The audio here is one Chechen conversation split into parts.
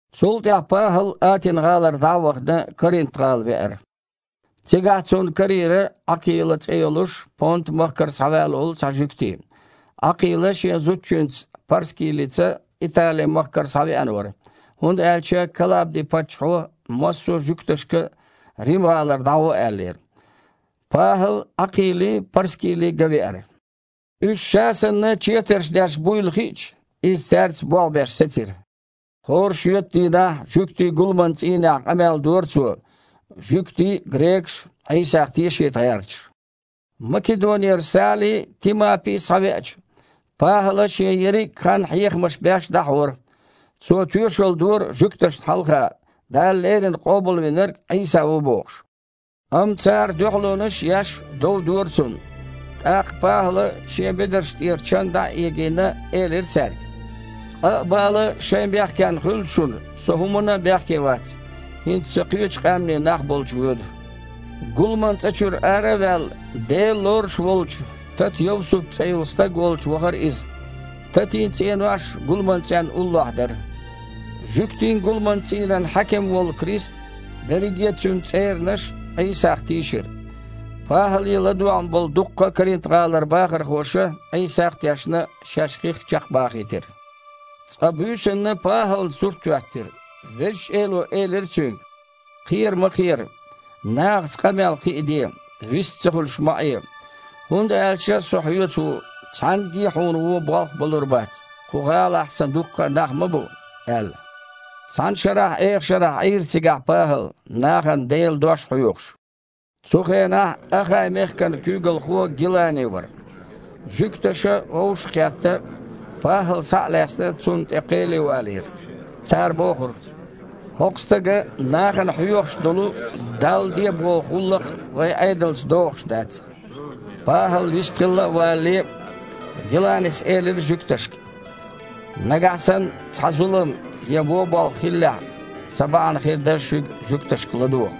Цул тІаьхьа ПахІал Атина-гІалара дІа а вахана, Коринт-гІала веара. Цигахь цунна карийра Іакхила цІе а йолуш, Понта-махкара схьаваьлла волу цхьа жуьгти. Іакхила шен зудчуьнца ПхьаьрскІилатаца Итали-махкара схьавеана вара, хІунда аьлча Калабди-паччахьо массо а жуьгташка Рим-гІалара дІагІо аьллера. ПахІал Іакхилий, Парскилий ган веара. Уьш, ша санна, четарш деш буйла хиъча, иза цаьрца болх а беш сецира. ХІора шоьтан дийнахь жуьгтийн гуламан цІийнехь къамел дора цо, жуьгтий а, грекаш а Іийсах тешийта гІерташ. Македонера Сали а, Тимапи а схьавеача, ПахІала шен ерриг а хан хьехамаш беш дІахьора. Цо тоьшалла дора жуьгташна хьалха, Дала леррина Къобалвинарг Іийса ву бохуш. Амма цара дуьхьалонаш а еш, дов дора цунна. ТІаккха ПахІала, шен бедарш тІера чан дІа а егийна, элира цаьрга: «Къа а, бала а шайн бехкенна хуьлда шуна, со хІуманна а бехке вац. ХІинца со кхечу къаьмнийн нах болчу воьду». Гуламан цІа чуьра ара а ваьлла, Дела лоруш волчу Тата-Йовсут цІе йолу стаг волчу вахара иза. Татин цІенош гуламан цІенна уллохь дара. Жуьгтийн гуламан цІийнан хьаькам волу Крисп а, берриге а цуьнан цІеранаш а Іийсах тийшира. ПахІале ладоьгІна болу дуккха а Коринт-гІалара бахархоша, Іийсах а тешна, шаьш хих чекхбахийтира. Цкъа буьйсанна ПахІална сурт хІоьттира. Везачу Эло элира цуьнга: «Кхера ма кхера! Нахаца къамел кхин а де, вист ца хуьлуш ма Іе! ХІунда аьлча Со хьоьца ву, цхьаьнгге а хьуна вон болх а балур бац – кху гІалахь Сан дуккха а нах ма бу», – аьлла. Цхьана шарахь эха шарахь Іийра цигахь ПахІал, нахана Делан дош хьоьхуш. Цу хенахь Ахай-мехкан куьйгалхо Гилани вара. Жуьгташа, вовшах а кхетта, ПахІал, схьа а лаьцна, цунна тІе кхеле валийра. Цара бохура: «ХІокху стага нахана хьоьхуш долу Далла де боху гІуллакх вайн Іедалца догІуш дац». ПахІал вистхилла а валале, Гиланис элира жуьгташка: «Нагахь санна цхьа зулам я вон болх хиллехь, сан бахьана хир дара шуьга, жуьгташка, ладогІа.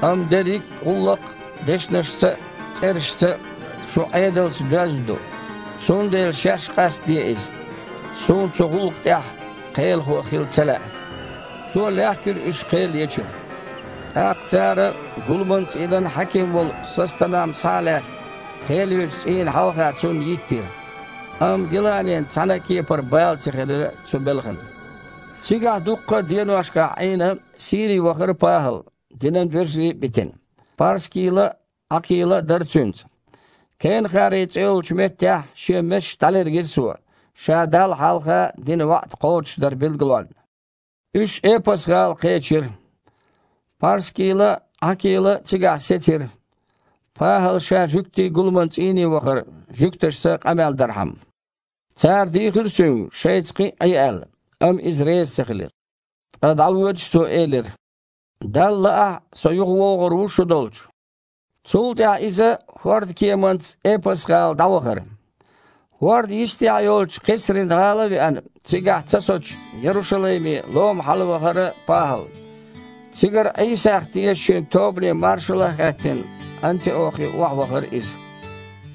Амма дерриг а гІуллакх дешнашца а, цІерашца а, шун Іедалца а доьзна ду, цундела шаьш къастаде иза. Суна цу гІуллакха тІехь кхелахо хила ца лаьа». Цо лаьхкира уьш кхел ечуьра. ТІаккха цара, гуламан цІийнан хьаькам волу Состанам схьа а лаьцна, кхел ечу цІийна хьалха цунна йиттира. Амма Гиланин цхьана а кепара бала ца хилира цу белхан. Цигахь дуккха а деношкахь Іийна, Сири вахара ПахІал, динан вежарий а битина. ПхьаьрскІилат а, Іакхила а дара цуьнца. Кенахари цІе йолчу меттехь шен месаш дІалергира цо, ша Далла хьалха дина ваІда кхочушдар билгалонна. Уьш Эпас-гІала кхечира. ПхьаьрскІилата а, Іакхила а цигахь сецира. ПахІал ша жуьгтийн гуламан цІийне вахара, жуьгташца къамел дархьама. Цара дийхира цуьнга, шайца кхин а Іе аьлла, амма иза реза ца хилира. Ткъа, дІавоьдуш, цо элира: «Далла лаахь, со юхавогІур ву шу долчу». Цул тІаьхьа иза хІордан кеманца Эпас-гІалара дІавахара. ХІордан йистехь йолчу Кхесрин-гІала а веана, цигахь ца соцуш, Ярушалайме, лома, хьалавахара ПахІал. Цигара Іийсах тешачийн тобане маршалла а хаьттина, Антиохе охьавахара иза.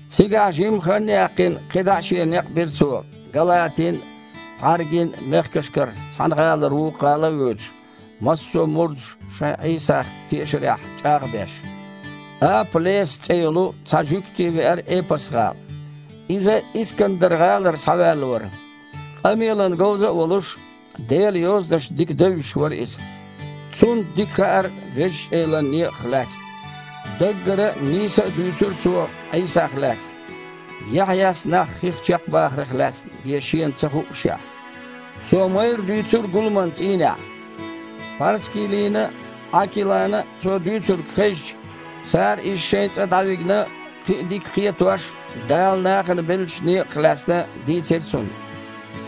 Цигахь жимма хан а яьккхина, кхидІа а шен некъ бира цо, Галатин а, Пхьаргин а мехкашкара цхьана гІалара вукху гІала а воьдуш, массо а мурдаш шайн Іийсах тешарехь чІагІ а беш. Апа-Леса цІе йолу цхьа жуьгти веара Эпас-гІала. Иза Искандар-гІалара схьаваьлла вара. Къамелана говза а волуш, Делан Йозанаш дика девзаш вара иза. Цунна дика хаьара Везачу Элан некъах лаьцна. Даггара а, нийса а дуьйцура цо Іийсах лаьцна, Яхьъяс нах хих чекхбахарх лаьцна бен шена ца хуъушехь. Цо майрра дуьйцура гуламан цІийнехь. ПхьаьрскІилатана а, Іакхилана а цо дуьйцург хезча, цара иза шайн цІа дІа а вигна, кхин а дика кхетош Дала нахана беллачу некъах лаьцна дийцира цунна.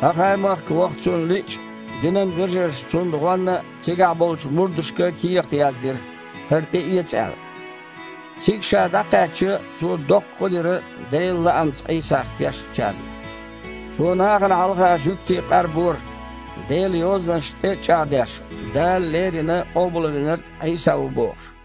Ахай-махка ваха цунна лиъча, динан вежарша цунна гІонна цигахь болчу мурдашка кехат яздира, хІара тІеэца аьлла. Цига ша дІакхаьчча, цо доккха гІо дира Делан лаамца Іийсах тешначарна. Цо нахана хьалха жуьгтий къарбора, Делан Йозанашна тІе а чІагІдеш, Дала леррина Къобалвинарг Іийса ву бохуш.